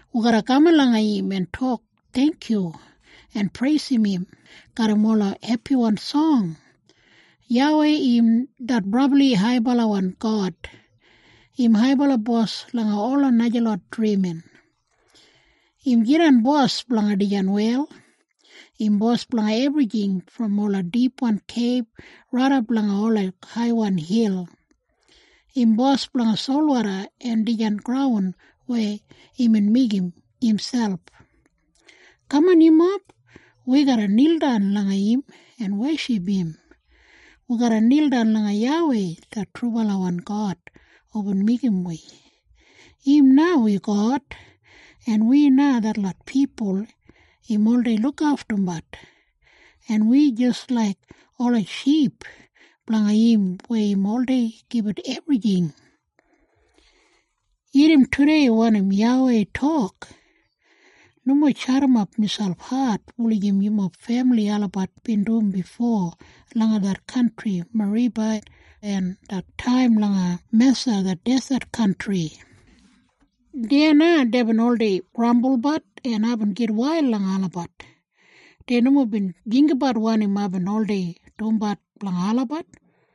Wi garra kaman langa im en tok theingkyu, en preisim im garram ola hepiwan song. YAWEI im det brabli haibalawan God. Im haibala bos langa ola najalot drimin. Im jidan bos blanga dijan wel. Im bos blanga ebrijing brom ola dipwan keib raidap langa ola haiwan hil. Im bos blanga solwoda en dijan graun weya imbin meigim imselp. Kaman yumob! Wi garra nildan langa im en weship im. Wi garra nildan langa YAWEI det trubalawan God hubin meigim wi. Im na wi God, en wi na detlot pipul im oldei lukaftumbat, en wi jis laik ola ship blanga im weya im oldei gibit ebrijing. Irrim tudei wanim YAWEI tok, “Nomo jadimap miselp hat wulijim yumob femili olabat bin dum bifo langa det kantri Meriba, en det taim langa Mesa det deset kantri. Deya na deibin oldei grambulbat en aibin gitwail langa olabat. Dei nomo bin jinggabat wanim aibin oldei dumbat blanga olabat.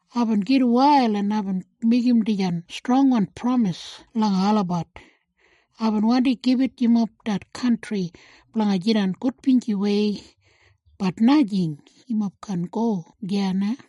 Aibin gitwail en aibin meigim dijan strongwan pramis langa olabat, ‘Aibin wandi gibit yumob det kantri blanga jidan gudbinjiwei, bat najing. Yumob kaan go deya na.’”